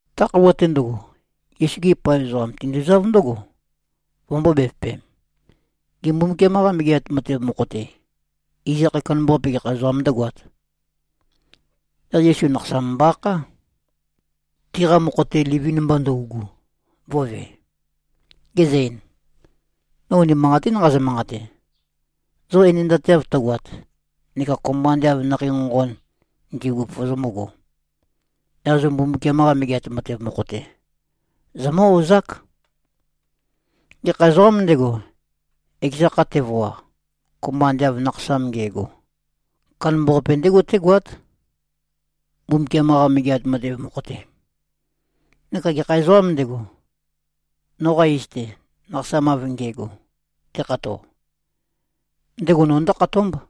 Ta khøuwa-te ndøgo, Yesu-gi paev ezoqam tinduzáv ndǿgo, vømbō-bevøpem, “Gê, Mbumbukiam-qa Megeat Matev mokho-te, iz akhae kandambaqape, gekha ezoqām ndǿgoāt?” Yaq Yesu nakhasam mbo-akhá, tiqa mokho-te livin-mba ndøugu, vø̄ve. Gezø-ein, “No unimanqatín nqazø-manqate. Zo enendateav tøgoat, neka kopømba ande av nakhei nqonqon ndi꞉gu vozomǿgō, yaq zo Mbumbukiam-qa Megeat Matev mokho-te, zomǿ-ozák. Gekha ezoqām ndego, ekeza kha tevoa, kopømba ande av nakhasam nge꞉go, kandambaqape ndégo tégoát, Mbumbukiam-qa Megeat Matev mokho-te. Neka gekha ezoqām ndego, noqa iz-te, nakhasam av nge꞉go tekhato, ndego no ndǿkhatómb.”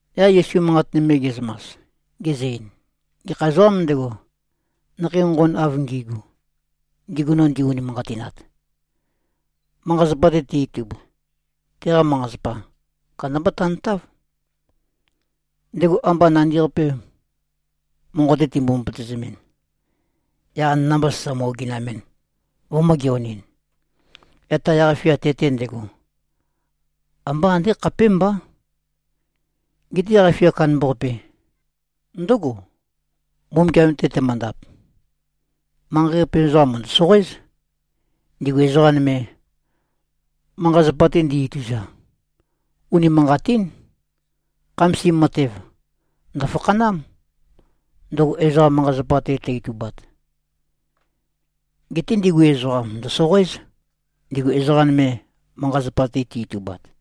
Yaq Yesu manqat nøme ge꞉zømas, gezø-ein, “Gekha ezoqām ndego, nakhei nqonqon av ngi꞉gu, ndigu no ndi-unimanqatinat, manqa-zapa-te te-itub, teqa manqa-zapa kandamba tantáv. Ndego amba nandi-qape monqo-te timbo-møpøtøzemɨn, yaq anana-mba sasa mø-oginamɨn, vømø̄-geonɨn, yaq ta yaq-fia te-te ndego, ambá andé khapémbá. Geté yaq-fia kandambaqape ndǿgo, Mbumbukiam-te temøndap. Manqei-qape ezoqam mø̀ndø-soqoéz, ndigu ezoqa nøme, manqa-zapa-te ndi-ituza. Unimanqatín. Khamasim matev, ndø̀fakhanám, ndøgo ezoqa manqa-zapa-te tø-itubat. Geté ndigu ezoqam ndø̀soqoéz, ndigu ezoqa nøme manqa-zapa-te ti-itubat.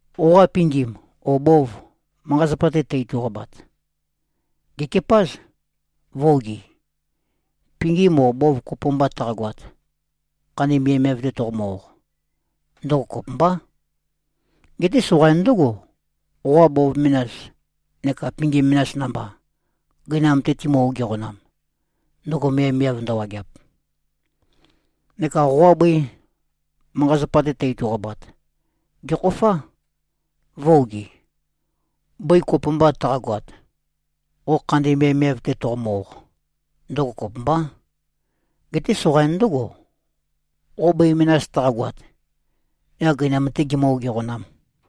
Qoqa pingim o bov manqa-zapa-te tø-ituqabat, gèkepáz, vø̄-ogi. Pingim o bov kopo mba taqagoat, khandi miavmiav-te toqomø-oq, ndøgo kopømbá. Geté soqain ndǿgo, qoqa bov menas neka pingim menas namba, gøinam-te timø-ogeqænam, ndøgo miavmiav ndøwageap. Neka qoqa bøi manqa-zapa-te tø-ituqabat, gèkhofá, vø̄-ogi. Bøi kopo mba taqagoat, qo khandi miavmiav-te toqomø-oq, ndøgo kopømbá. Geté soqain ndǿgo, qo bøi menas taqagoat, yaq gøinam-tē gimǿ-ogeqænām.”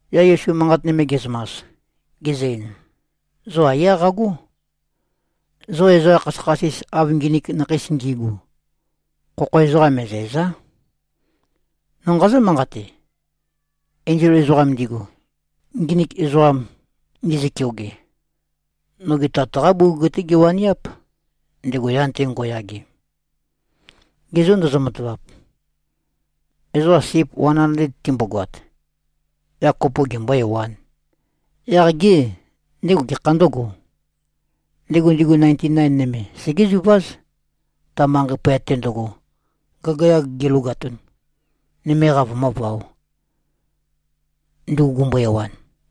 Yaq Yesu manqat nøme ge꞉zømas, gezø-ein, “Zo aiyá qagó. Zo ezoqa khasøkhasis, av nginik nakheis ngi꞉gu, khokho ezoqam me꞉zæ̀za᷄. No nqazǿ-manqate: Enzol ezoqam ndigu, nginik ezoqam ndizø-keoge, noge Tat-qá bugug-té giwaniáp, ndego yan-te ngo꞉yage. Ge zô ndozo-matavap? Ezoqa sip wan andled timbogoat, yaq kopo gembō-ewān, yaq gê, ndego gekhā ndǿgō? Ndego ndigu nainti-nain nøme, segéziváz, ta manqei poyat-te ndøgo, gagayag gilogatun, nøme-qa vømǿvaō, ndugu gumbo-ewan.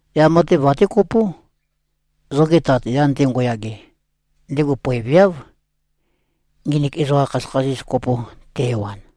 Yaq matev até kopó. Zoge Tat yan-te ngo꞉yage, ndego poeveáv, nginik ezoqa khasøkhasis, kopo te-ewan.”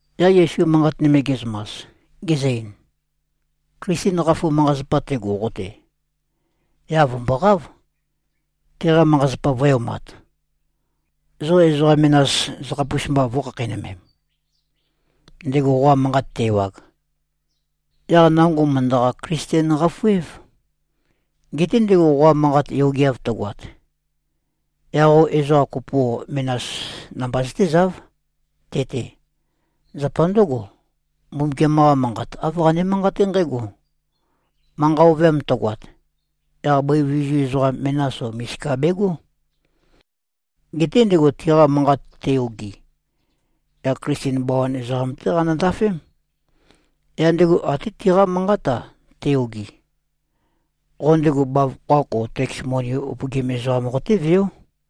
Yaq Yesu manqat nøme ge꞉zømas, gezø-ein, “Klisten qafu manqa-zapa tego qo-te, yaq vø̀mboqáv, teqa manqa-zapa vø̄e-omat, zo ezoqa menas zøkhapus-mba vø̄khakheinømem. Ndego qoqa manqat te-ewag, yaq nango mø̀ndøqa-Klisten-qafu-év. Geté ndego qoqa manqat yogeav tøgoat, yaq qo ezoqa kopo o menas namba zøtézáv, te-te. Zapa ndǿgo, Mbumbukiam-qa Manqat āv qane-manqaté nqǽgo, ‘Manqa ovøyam tøgoat, yaq bøi vizu ezoqam menas o misika begó.’ Geté ndego tiqa manqat te-ogi, yaq Klisten bawan ezoqam-té qanø-ndafém. Yaq ndego até tiqá manqát-a te-ogi, qo ndego bavokho-ak o teks moni upøgim ezoqam qotéveó.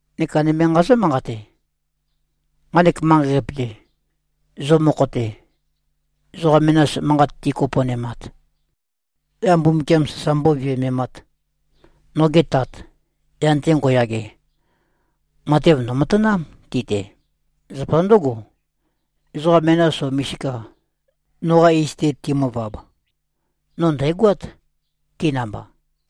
Neka nøme nqazǿ-manqate: Nqanek manqei-qape-te, zo mokho-te, ezoqa menas manqat tikoponemat, yaq Mbumbukiam sasa mbóviømemāt, noge Tat, yan-te ngo꞉yage, matev ndø̀matanám ti-te. Zapa ndǿgo, ezoqa menas o misika noqa iz-te timøvab, no ndæ̀goát, ti namba.”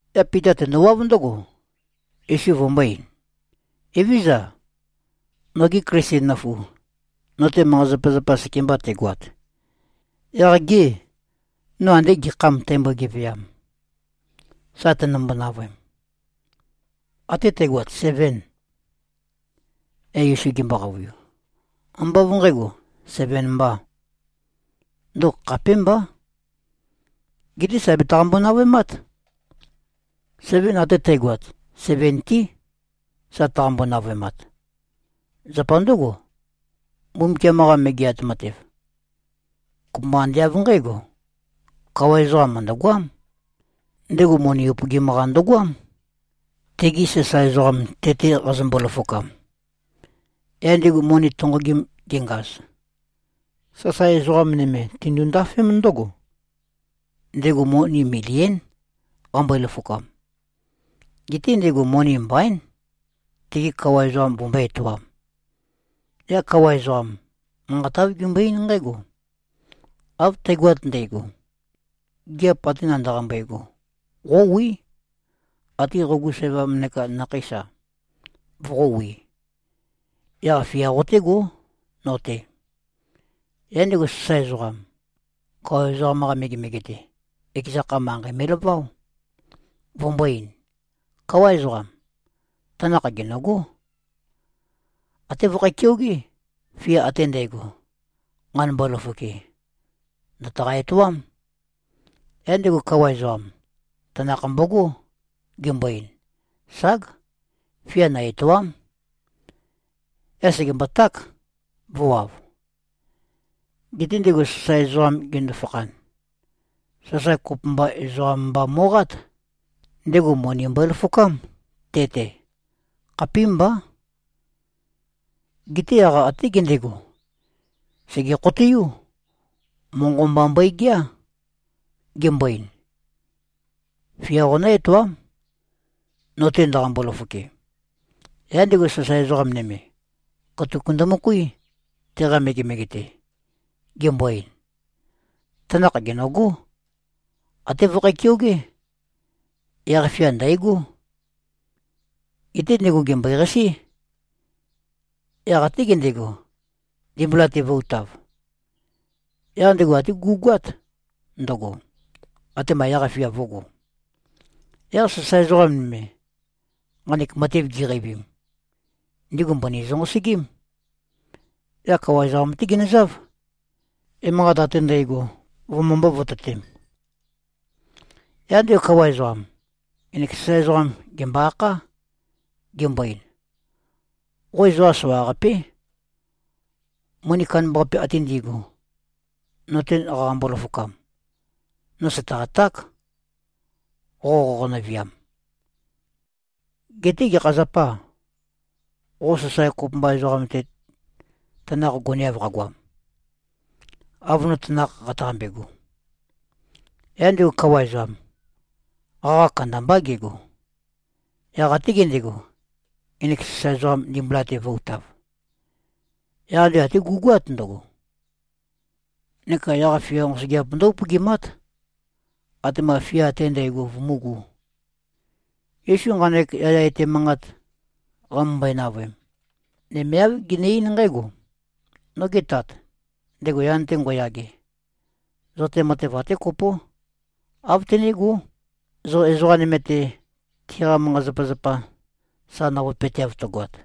Yaq Pita tendowáv ndǿgo, Yesu vømbō-ein, “Evézøza. Noge Klisten nøfu, no-te manqa-zapazapa sekemba tegoat, yaq gê, no andé gekhâm tæmbo-geveam, sa tønømbo-navøem? Até tægoat sevên?” Yaq Yesu gembo-qavøiu, “Ambá av nqægo, seven mbā. Ndøgo khapémbá. Geté sà betaqambo-navøemát. Seven até tægoat seventí, sa tøqambo-navøemat. Zapa ndǿgo, Mbumbukiam-qa Megeat Matev, kopømba ande av nqǽgo: Kawa ezoqam mø̀ndøgoám. Ndego moni upøgim-qa ndøgoám, tegi sasae ezoqam te-te qazømbo-løfokam. Yaq ndego moni tonqogim gengaz, sasae ezoqa nøme tindu-ndafém ndǿgo. Ndego moni milión, qambøe-løfokam. Geté ndego moni mbaín, tege kawa ezoqam vømbøé-etoām. Yaq kawa ezoqam, manqat āv gembøe-eín nqǽgo, ‘Av tægoat ndægo. Gigiap ate ndaqambe꞉go, qówí. Até qogu sævam neka nakheís-a, voqówī. Yaq fia qotégó, no-te.’ Yaq ndego sasae ezoqam, kawa ezoqam-qa megemege-te, ekeza kha, manqei me꞉laváo, vømbō-ein, ‘Káwa ezoqam. Tanakh gènøgó. Até vøkhæ-keogé. Fia ate ndægo, nqanømbo-løfoke, ndø̀taqa-etoám.’ Yaq ndego kawa ezoqam, tanakh mbogó, gembo-ein, ‘Ság! Fia nø-ètoa᷄m.’ Yaq sègemboták, vø̄wav. Geté ndego sasae ezoqam gendo-fakhan, sasae kopømba ezoqam mba mo꞉qát. Ndego moni mbøe-løfokám, te-te. Khapímbá. Geté yaq até gendego, sège-khoteiú. Monqo mba mbøegeá, gembo-ein, ‘Fia qonǿ-etoám, no-te ndaqambo-løfoke.’ Yaq ndego sasae ezoqa nøme, katuk ndømøkuí, teqa megemege-te, gembo-ein, ‘Tanakh gènøgó. Até vøkhæ-keogé. Yaq fia ndæ̀gó.’ Geté ndego gèmbøeqasí. Yaq até gendego, ndimbula-te vø̄-utav. Yaq ndego até gú꞉goát ndøgo, atema yaq-fia vǿgō. Yaq sasae ezoqa nøme, nqanek matev giqeivim, ndigu mbøni zønqosøgím. Yaq kawa ezoqam-té ginøzáv, emanqat ate ndægo vømømbō-vototem. Yaq ndego kawa ezoqam, ngenek sasae ezoqam, gèmbo-akhá. Gembo-ein, ‘Qo ezoqa soqaqapé. Moni kandambaqapi ate ndi꞉gu, no-te qaqambo-løfokam, no sø̀taqaták, qo qoqonø-viam. Geté gekha zapâ, qo sasae kopømba ezoqam-te tanakh goneav qagoam, av no tanakh qataqambego?’ Yaq ndego kawa ezoqam, qaqa kandambá gego. Yaq até gendego, ngenek sasae ezoqam ndimbula-te vø̄-utav. Yaq ndego até gú꞉goát ndøgo. Neka yaq-fia nqosøgeap ndǿ-upøgimát, atema fia ate ndægo vømúgū.” Yesu nqanek yaya etæ manqat qamømbøe-navøem, nøme āv gene-eín nqǽgo, “Noge Tat, ndego yan-te ngo꞉yage, zo-te matev até kopó, āv tenégó, zo ezoqa nøme-te, tiqa manqa-zapazapa, sa navøepøteav tøgoat.”